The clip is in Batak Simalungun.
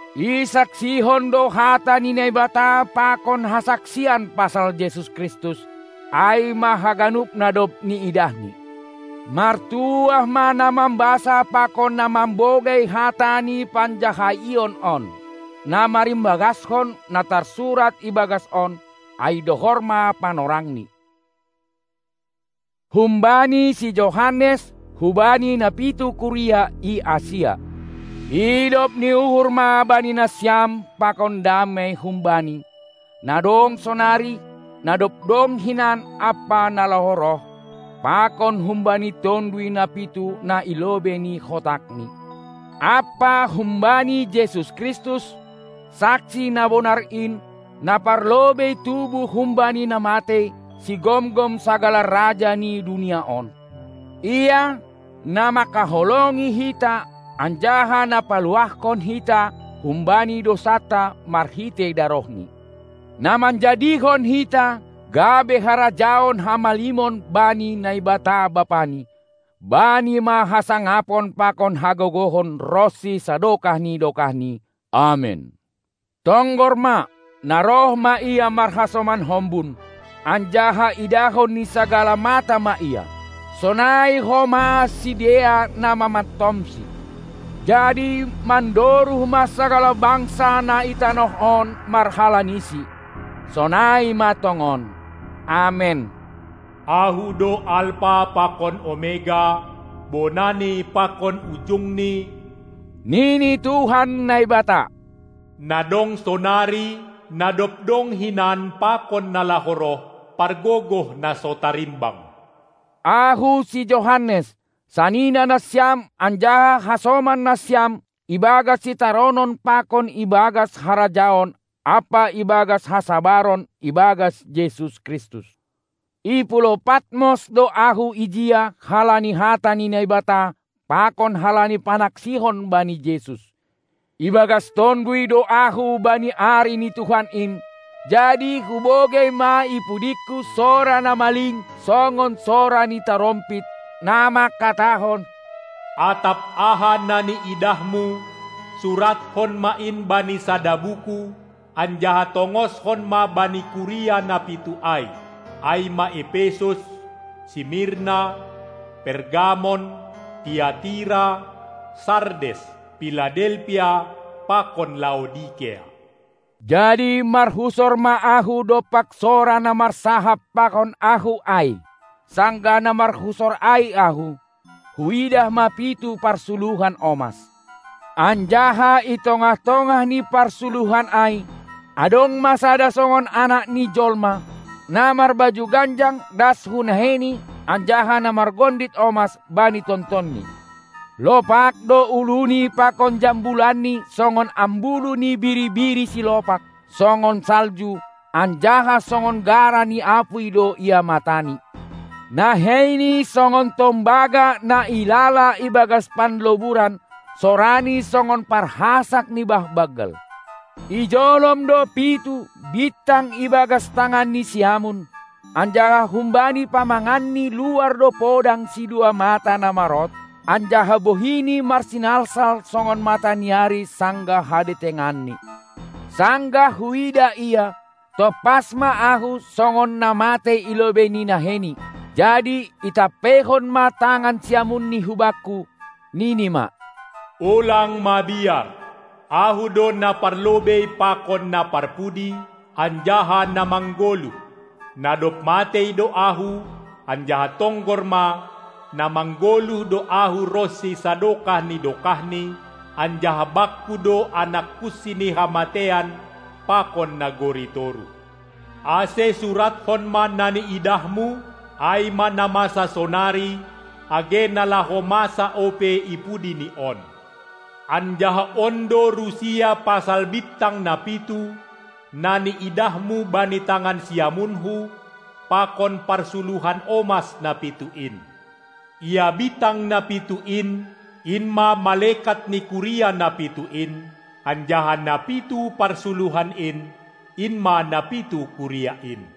Isaksihon do hata ni Naibata pakon hasaksian pasal Jesus Kristus, ai ma haganup na dob niidahni. Martuah ma na mambasa pakon na mambogei hata ni panjahaion on, na marimbagaskon na tarsurat ibagas on, ai dohor ma panorangni. Humbani si Johannes hubani na pitu kuria i Asia: Idop ni uhur ma bani nasiam pakon damei hum Bani, na dong sonari, na dob dong hinan ampa na laho roh, pakon humbani tonduy na pitu na i lobei ni hotakNi, ampa humbani Jesus Kristus, saksi na bonar in, na parlobei tubuh humbani na matei, sigomgom sagala raja ni dunia on. Ia, na manghaholongi hita anjaha na paluahkon hita humbani dousanta marhitei darohNi, na manjadihon hita gabe harajaon hamalimon bani Naibata Bapani: Bani ma hasangapon pakon hagogohon ronsi sadokah ni dokahni! Amen. Tonggor ma, na roh ma Ia marhasoman hombun, anjaha idahon ni sagala mata ma Ia, sonai homa sidea na mamantom-Si; jadi mandoruh ma sagala bangsa na i tanoh on marhalani-Si. Sonai ma tongon. Amen. Ahu do Alpa pakon Omega, Bonani pakon Ujungni, nini Tuhan Naibata, na dong sonari, na dob dong hinan pakon na laho roh, Pargogoh na so tarimbang. Ahu si Johannes, sanina nasiam anjaha hasoman nasiam ibagas sitaronon pakon ibagas harajaon ampa ibagas hasabaron ibagas Jesus Kristus; i pulou Patmos do ahu ijia halani hata ni Naibata pakon halani panaksihon bani Jesus. Ibagas Tonduy do ahu bani ari ni Tuhan in; jadi hubogei ma i pudingku sora na maling songon sora ni tarompit, na manghatahon: Atap aha na niidahmu, suratkon ma in bani sada buku anjaha tongoshon ma bani kuria na pitu ai, ai ma Epesus, Simirna, Pergamon, Tiatira, Sardes, Piladelpia pakon Laodikea. Jadi marhusor ma ahu dompak sora na marsahap pakon ahu ai. Sanggah na marhusor ai ahu, huidah ma pitu parsuluhan omas. Anjaha i tongah-tongah ni parsuluhan ai adong ma sada songon Anak ni Jolma, na marbaju ganjang das hu naheiNi anjaha na margondit omas bani tontonNi. Lopak do uluNi pakon jambulanNi songon ambulu ni biri-biri silopak, songon salju, anjaha songon gara ni apuy do ia mataNi. NaheiNi songon tombaga na ilala ibagas panloburan, soraNi songon parhasak ni bah banggal. Ijolom do pitu bintang ibagas tanganNi siamun, anjaha humbani pamanganNi luar do podang sidua mata na marot, anjaha bohiNi marsinalsal songon mataniari sanggah hadetenganni. Sanggah huidah Ia, tompas ma ahu songon na matei i lobei ni naheiNi. Jadi itampeihon ma tangan siamunni hubakku, nini ma: Ulang mabiar! Ahu do Naparlobei pakon Naparpudi, anjaha na manggoluh. Na dob matei do Ahu, anjaha tonggor ma, na manggoluh do Ahu ronsi sadokah ni dokahni, anjaha Bakku do anak kunsi ni hamateian pakon nagori toruh. Ase suratkon ma na niidahmu, ai ma na masa sonari, age na laho masa ope i pudi ni on. Anjaha on do rusia pasal bintang na pitu, na niidahmu bani tangan siamunKu pakon parsuluhan omas na pitu in: Ia bintang na pitu in, in ma malekat ni kuria na pitu in, anjaha na pitu parsuluhan in, in ma na pitu kuria in.